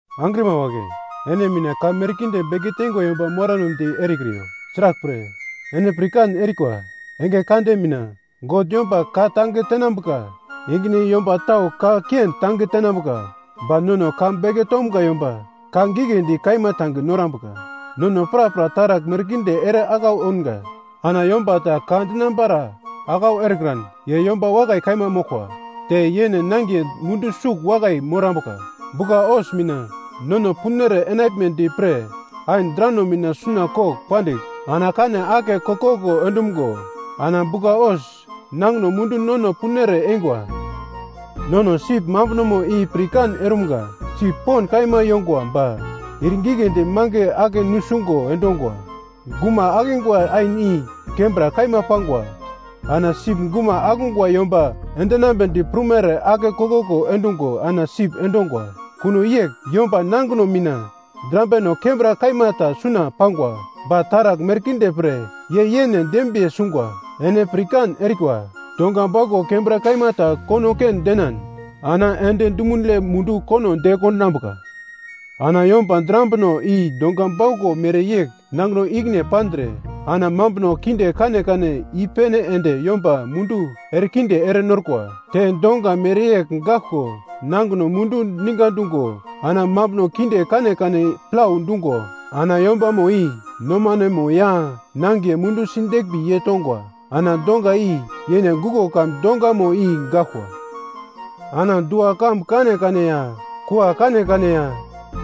Angrima wagle, ene mina ka merkinde beke teingwa yomba moramnedi erekriyo, sraglpre, ene pirkan erikwa, enge kande mina God yomba ka tange tenambuka ingine yomba tau ka kiendi tange tenambuka ba nono ka beke tomga yomba ka giglendi kaima tange norambuka. Nono prapra taragl merkinde ere aglau ounga. Ana yomba ta ka dinambara aglau erekran ye yomba wakai kaima moglkwa. Te yene nangiye mundu sugl wakai morambuka. Bugla-hos mina nono punere enaglmedi pre ain drano mina suna kogl pandigl ana kane ake koglkoglo endumgo ana bugla-hos nangino mundu nono punere eingwa. Nono sip mambunomo i pirkan eramga. Sip pond kaima yongwa ba ir giglendi mange ake nusungo endongwa. Guma akingwa ain i kembra kaima pangwa, ana sip guma akungwa yomba enambedi prumere ake koglkoglo endungo ana sip endongwa. Kuno yegl, yomba nangino mina drambino kembra kaima ta suna pangwa, ba taragl merkinde pre ye yene dembiye sungwa. Ene pirkan erikwa, donga bauglo kembra kaima ta kono ken denan ana endi dumunle mundu kono de kondinambuka. Ana yomba drambino i donga bauglo mereyegl ye nangino ikine pandre, ana mambuno kinde kanekane i-pene ende yomba mundu erekinde ere norkwa. Te donga mereyegl gaglko nangino mundu ninga dungo ana mambuno kinde kanekane plau dungo ana yombamo i nomanemo ya nangiye mundu sideglmbi yei tongwa. Ana donga i yene guglo kamun dongamo i gaglkwa. Ana dua-kambu kanekane ya kua kanekane ya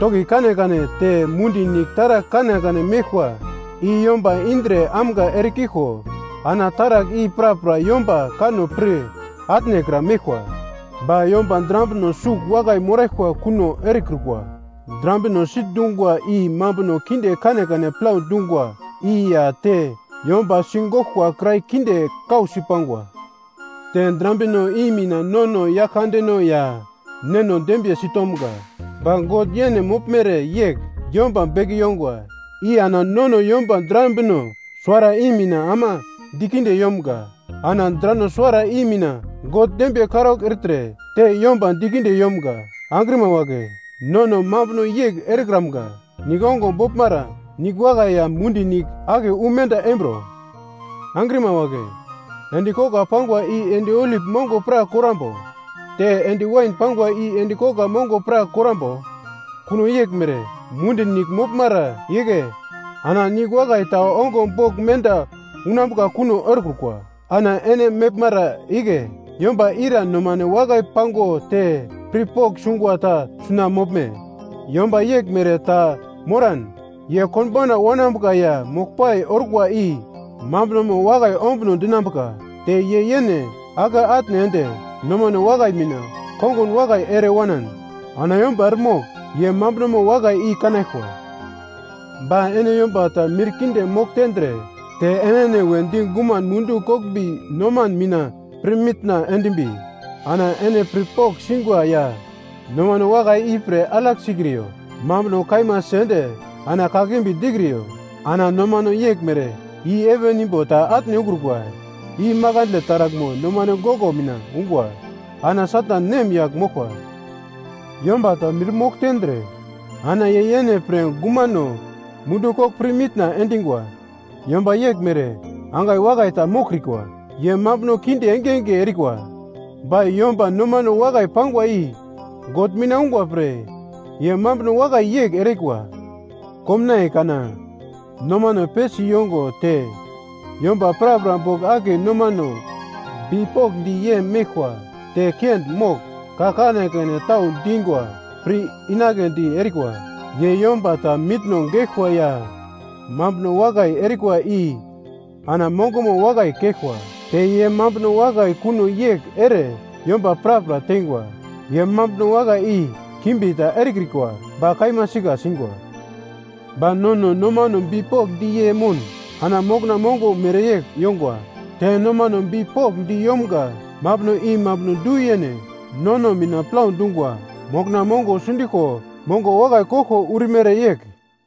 toki kanekane te mundi nigl taragl kanekane meglkwa, i yomba indre amga ere kiglko ana taragl i prapra yomba kanno pir atnekra meglkwa. Ba yomba drambino sugl wakai moraglkwa kuno erekrukwa. Drambino sitndungwa i mambuno kinde kanekane plau dungwa i ya te yomba sigoglkwa kirai kinde kausi pangwa. Te drambino i mina nono Yaglkandeno ya Neno dembiyesi tomga. Ba God yene moglmere yegl yomba beke yongwa i ana nono yomba drambino suwara i mina ama dikinde yomga. Ana drano suwara i mina God dembiye karaugl ertre te yomba dikinde yomga. Angrima wagle nono mambuno yegl erekramga. Nigl ongo boglmara nigl wakai ya mundi nigl akiye wu mende embro? Angrima wagle, endi kogla pangwa i endi olip mongo pra karambo? Te endi wain pangwa i endi kogla mongo pra korambo? Kuno yeglmere, mundi nigl moglmara igle ana nigl wakai ta ongo bogl menda unambuka kuno erekrukwa. Ana ene meglmara igle yomba ira nomane wakai pango te pirpogl sungwa ta suna moglme? Yomba yeglmere ta moran ye konbauna wanambuka ya moglpai orkwa i mambunomo wakai ombuno dinambuka. Te ye yene ake atne ende nomane wakai mina kongun wakai ere wanan, ana yomba eremogl ye mambunomo wakai i kanaglkwa. Ba ene yomba ta mir kinde mogl tendre te enene wedi guman mundu koglmbi nomane mina pirmitna endimbi, ana ene pirpogl singwa ya nomane wakai ipre alagl sikriyo. Mambuno kaima sende ana kakimbi dikriyo. Ana nomane yeglmere i heven imbo ta atne ukrukwa, i makandle taraglmo nomane goglo mina ungwa ana Satan nem yagl moglkwa. Yomba ta mirmogl tendre, ana ye yene pre gumano mundu kogl pirmitna endingwa. Yomba yeglmere angai wakai ta moglkrikwa. Ye mambuno kinde engenge erikwa. Ba yomba nomane wakai pangwa i God mina ungwa pre ye mambuno wakai yegl erikwa. Komnaiye kana nomane pesi yongo te yomba prapra bogl akiye nomane bipokndi yei meglkwa te kiendi mogl, ka kanekane tau dingwa, pir inagledi erikwa. Ye yomba ta mitna geglkwa ya mambuno wakai erikwa i ana mongomo wakai keglkwa. Te ye mambuno wakai kuno yegl ere yomba prapra teingwa. Ye mambuno wakai i kimbi ta erekrikwa ba kaima sika singwa. Ba nono nomano bipokndi yei moun ana mokna mongo mereyegl yongwa. Te nomano bipokndi yomga mambuno i mambuno du-yene nono mina plau dungwa mokna mongo sundiglko mongo wakai koglko urimere yegl.